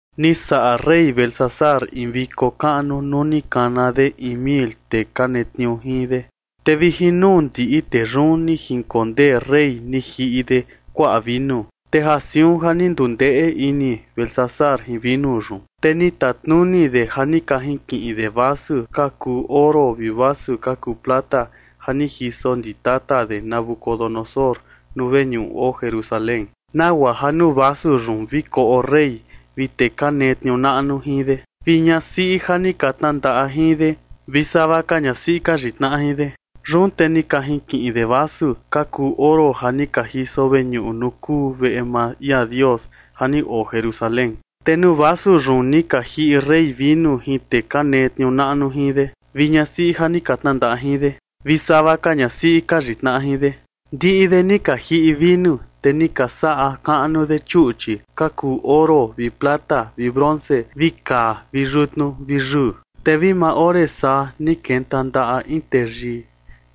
Ni saꞌa rey Belsasar in viko kaꞌnu nuu ni kana de in mil tee ka netniuu jin de, te vi jin nuu ndiꞌi tee yun ni jinkondee rey ni jiꞌi de kuaꞌa vinu. Te ja siun ja ni ndundee ini Belsasar jin vinu yun, te ni tatnuni de ja ni ka jinkiꞌin de vasu ka kuu oro vi vasu ka kuu plata ja ni jiso ndi tata de Nabucodonosor nuu veñuꞌu oo Jerusalén, nagua ja nuu vasu yun vi koꞌo rey, vi tee ka netniuu naꞌnu jin de, vi ñasiꞌi ja ni ka tnandaꞌa jin de, vi sava ka ñasiꞌi ka yitnaꞌa jin de. Yun te ni ka jinkiꞌin de vasu ka kuu oro ja ni ka jiso veñuꞌu nuu kuu veꞌe maa ia Dios ja ni oo Jerusalén, te nuu vasu yun ni ka jiꞌi rey vinu jin tee ka netniuu naꞌnu jin de, vi ñasiꞌi ja ni ka tnandaꞌa jin de, vi sava ka ñasiꞌi ka yitnaꞌa jin de. Ndiꞌi de ni ka jiꞌi vinu, te ni ka saꞌa kaꞌnu de chuꞌchi ka kuu oro vi plata vi bronce vi kaa vi yutnu vi yuu. Te vi maa ore saa ni kenta ndaꞌa in teyii,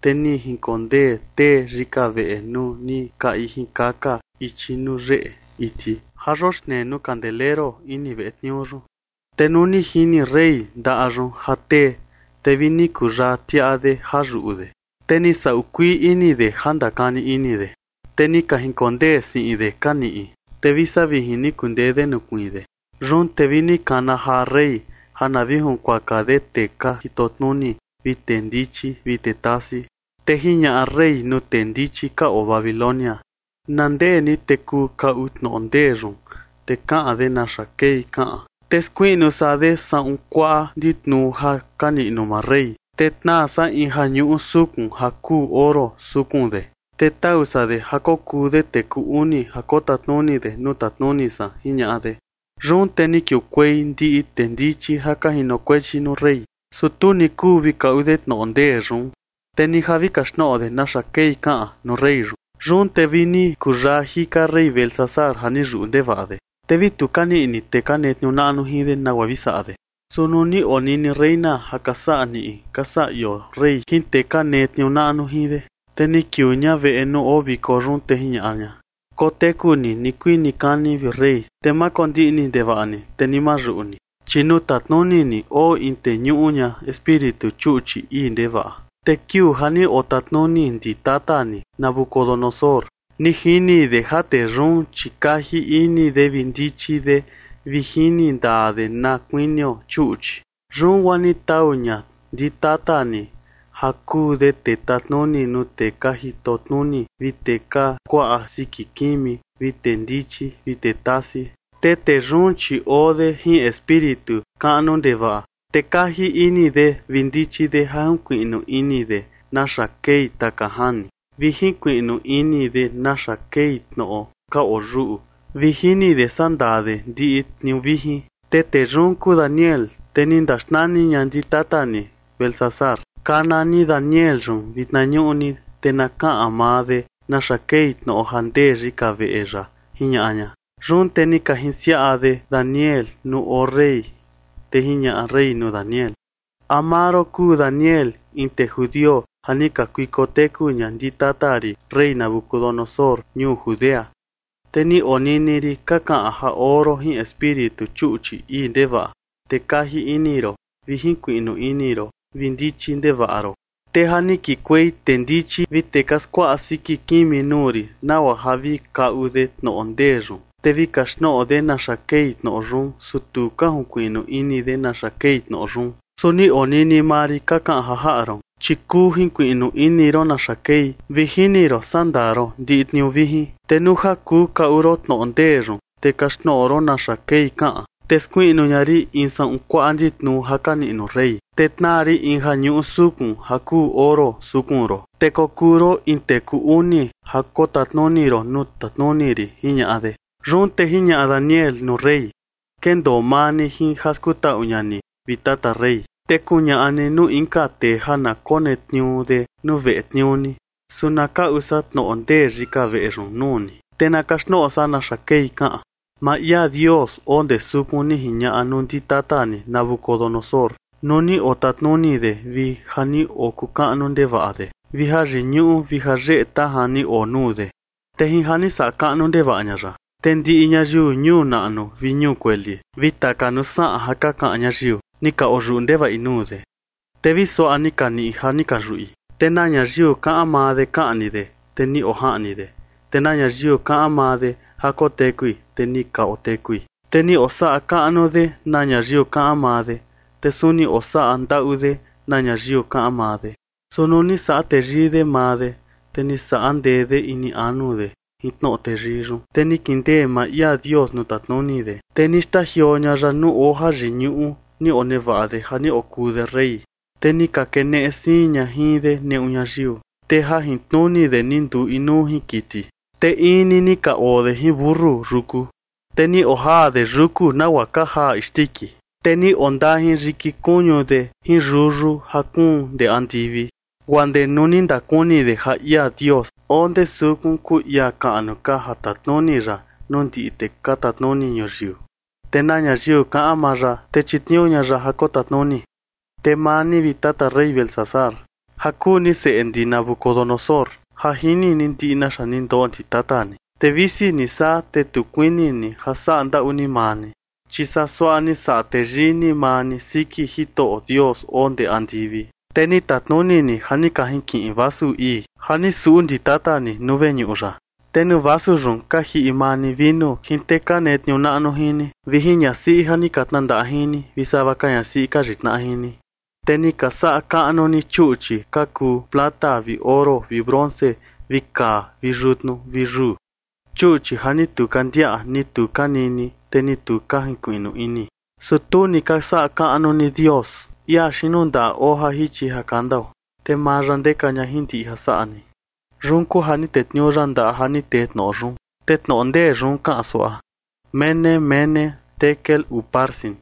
te ni jinkondee tee yika veꞌe nuu ni kaꞌi jin kaka ichi nuu yeꞌe iti ja yoxnee nuu kandeleru ini veꞌe tniuu yun. Te nuu ni jini rey ndaꞌa yun ja tee, te vi ni kuyaa tiaꞌa de ja yuꞌu de, te ni saꞌu kuii ini de ja ndakani ini de, te ni ka jinkondee siꞌin de ka niꞌi, te vi saa vijin ni kundee de nukuiin de. Yun te vi ni kana jaa rey, ja na vi jinkuaka de tee ka jitotnuni vi tee ndichi vi tee tasi. Te jiñaꞌa rey nuu tee ndichi ka oo Babilonia: ―Na ndee ni tee kuu kaꞌu tnoꞌo ndee yun, te kaꞌan de naxa kei kaꞌan, te skuiꞌnu san de saꞌun kuaꞌa nditnu ja ka niꞌnu maa rey, te tnaa san in jañuꞌu sukun ja kuu oro sukun de, te tau san de ja kokuu de tee kuu uni ja kotatnuni de nuu tatnuni san ―jiñaꞌa de. Yun te ni kiukuei ndiꞌi tee ndichi ja ka jinokuechi nuu rey, su tu ni kuu vi kaꞌu de tnoꞌo ndee yun, te ni ja vi kaxtnoꞌo de naxa kei kaꞌan nuu rey yun. Yun te vi ni kuyaa jika rey Belsasar ja ni yuꞌu ndevaꞌa de. Te vi tu ka nii ini tee ka netniuu naꞌnu jin de nagua vi saꞌa de. Su nuu ni onini reina ja ka saꞌa niꞌi ka saꞌa ioo rey jin tee ka netniuu naꞌnu jin de, te ni kiuu ña veꞌe nuu oo viko yun, te jiñaꞌa ña: ―Koteku ni nikuii nikani, vi rey. Te ma kondiꞌni ndevaꞌa ni, te ni ma yuꞌu ni. Chi nuu tatnuni ni, oo in tee ñuꞌu ña espíritu chuꞌchi ii ndevaꞌa. Te kiuu ja ni otatnuni ndi tata ni Nabucodonosor, ni jini de ja tee yun, chi kaji ini de vi ndichi de vi jini ndaa de na kuinio chuꞌchi. Yun guaa ni tau ña ndi tata ni ja kuu de tee tatnuni nuu tee ka jitotnuni vi tee ka skuaꞌa siki kimi vi tee ndichi vi tee tasi. Te tee yun, chi oo de jin in espíritu kaꞌnu ndevaꞌa, te kaji ini de vi ndichi de ja jinkuiꞌnu ini de naxa kei taka jani, vi jinkuiꞌnu ini de naxa kei tnoꞌo ka oyuꞌu, vi jini de sandaa de ndiꞌi tniuu vijin. Te tee yun kuu Daniel, te ni ndaxnani ña ndi tata ni Beltsasar. Kana ni Daniel yun vitna ñuꞌni, te na kaꞌan maa de naxa kei tnoꞌo ja ndee yika veꞌe yaꞌa ―jiñaꞌa ña. Yun te ni ka jinsiaꞌa de Daniel nuu oo rey, te jiñaꞌa rey nuu Daniel: ―¿A maa ron kuu Daniel, in tee judio ja ni kakuiko teku ña ndi tata rin rey Nabucodonosor ñuu Judea? Te ni onini rin ka kaꞌan ja oo ron jin espíritu chuꞌchi ii ndevaꞌa, te kaji ini ron vi jinkuiꞌnu ini ron vi ndichi ndevaꞌa ron. Te ja ni kikuei tee ndichi vi tee ka skuaꞌa siki kimi nuu rin, nagua ja vi kaꞌu de tnoꞌo ndee yun, te vi kaxtnoꞌo de naxa kei tnoꞌo yun, su tu ka jinkuiꞌnu ini de naxa kei tnoꞌo yun. Su ni onini maa rin ka kaꞌan ja jaꞌa ron, chi kuu jinkuiꞌnu ini ron naxa kei, vi jini ron sandaa ron ndiꞌi tniuu vijin. Te nuu ja kuu kaꞌu ron tnoꞌo ndee yun, te kaxtnoꞌo ron naxa kei kaꞌan, te skuiꞌnu ña rin in saꞌun kuaꞌa nditnu ja ka niꞌnu rey, te tnaa rin in jañuꞌu sukun ja kuu oro sukun ron, te kokuu ron in tee kuu uni ja kotatnuni ron nuu tatnuni rin ―jiñaꞌa de. Yun te jiñaꞌa Daniel nuu rey: ―Kendoo maa ni jin ja skutaꞌu ña ni, vi tata rey, te kuñaꞌa ni nuu inka tee ja na konetniuu de nuu veꞌe tniuu ni. Su na kaꞌu san tnoꞌo ndee yika veꞌe yun nuu ni, te na kaxtnoꞌo san naxa kei kaꞌan. ’Maa ia Dios oo ndee sukun ni jiñaꞌa nuu ndi tata ni Nabucodonosor nuu ni otatnuni de vi ja ni okuu kaꞌnu ndevaꞌa de vi jayiñuꞌu vi jayeꞌe tajan ni oo nuu de. Te jin ja ni saꞌa kaꞌnu ndevaꞌa ña ya, te ndiꞌi ñayiu ñuu naꞌnu vi ñuu kueli vi taka nuu saꞌan ja ka kaꞌan ñayiu, ni ka oyuꞌu ndevaꞌi nuu de. Te vi suaꞌa ni ka niꞌi ja ni ka yuꞌi. Te na ñayiu kaꞌan maa de kaꞌni de, te ni ojaꞌni de. Te na ñayiu kaꞌan maa de ja kotekui, te ni ka otekui. Te ni osaꞌa kaꞌnu de na ñayiu kaꞌan maa de, te suni ni osaꞌa ndaꞌu de na ñayiu kaꞌan maa de. Su nuu ni saꞌa teyii de maa de, te ni saꞌa ndee de ini anu de jin tnoꞌo teyii yun, te ni kindee maa ia Dios nuu tatnuni de, te ni xtajioo ña ya nuu oo jayiñuꞌu ni onevaꞌa de ja ni okuu de rey. Te ni ka keneꞌe siin ña jin de neꞌu ñayiu, te jajintnuni de ni nduu inuu jin kiti. Te in ni ni ka oo de jin mentu yuku. Te ni ojaa de yuku, nagua ka jaa isndiki, te ni ondajin yiki kuñu de jin yuyu ja kuun ndee andivi, guaa ndee nuu ni ndakuni de ja ia Dios oo ndee sukun kuu ia kaꞌnu ka ja tatnuni ya nuu ndiꞌi tee ka tatnuni ñuyiu, te na ñayiu kaꞌan maa ya, te chitniuu ña ya ja kotatnuni. Te maa ni, vi tata rey Belsasar, ja kuu ni seꞌe ndi Nabucodonosor, ja jini ni ndiꞌi naxa ni ndoꞌo ndi tata ni, te visi ni saa, te tu kuini ni ja saꞌa ndaꞌu ni maa ni. Chi saa suaꞌa ni saꞌa teyii ni maa ni siki Jitoꞌo Dios oo ndee andivi, te ni tatnuni ni ja ni ka jinkiꞌin vasu ii ja ni suꞌu ndi tata ni nuu veñuꞌu ya, te nuu vasu yun ka jiꞌi maa ni vinu jin tee ka netniuu naꞌnu jin ni, vi jin ñasiꞌi ja ni ka tnandaꞌa jin ni, vi sava ka ñasiꞌi ni. Te ni ka saꞌa kaꞌnu ni chuꞌchi ka kuu plata vi oro vi bronce vi kaa vi yutnu vi yuu, chuꞌchi ja ni tu ka ndiaꞌa, ni tu ka nini, te ni tu ka jinkuiꞌnu ini. Su tu ni ka saꞌa kaꞌnu ni Dios, ia xiin nundaꞌa oo ja jichi ja kandao, te maa ya ndeka ña jin ndiꞌi ja saꞌa ni. Yun kuu ja ni tetniuu ya ndaꞌa ja ni tee tnoꞌo yun. Te tnoꞌo ndee yun kaꞌan suaꞌa: “Mene, Mene, Tekel, Uparsin”.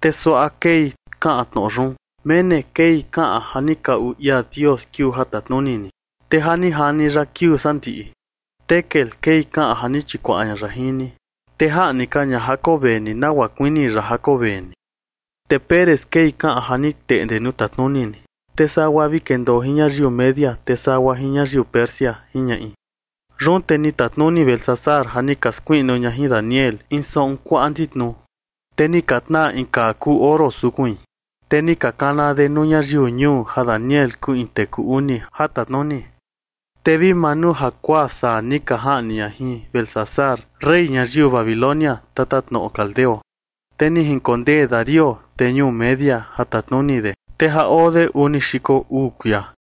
Te suaꞌa kei kaꞌan tnoꞌo yun: “Mene” kei kaꞌan ja ni kaꞌu ia Dios kiuu ja tatnuni ni, te ja ni jani ya kiuu sandiꞌi. “Tekel” kei kaꞌan ja ni chikuaꞌa ña ya jin ni, te jaꞌni ka ña ja kovee ni nagua kuini ya ja kovee ni. Te “Peres” kei kaꞌan ja ni teꞌnde nuu tatnuni ni, te sagua vi kendoo jin ñayiu Media te sagua jin ñayiu Persia ―jiñaꞌi. Yun te ni tatnuni Belsasar ja ni ka skuiꞌnu ña jin Daniel in saꞌun kuaꞌa nditnu, te ni ka tnaa in kaa kuu oro sukuin, te ni ka kana de nuu ñayiu ñuu ja Daniel kuu in tee kuu uni ja tatnuni. Te vi maa nuu jakuaa saa, ni ka jaꞌni ña jin Belsasar, rey ñayiu Babilonia, tatatnoꞌo caldeo. Te ni jinkondee Darío, tee ñuu Media, ja tatnuni de, te ja oo de uni xiko uu kuia.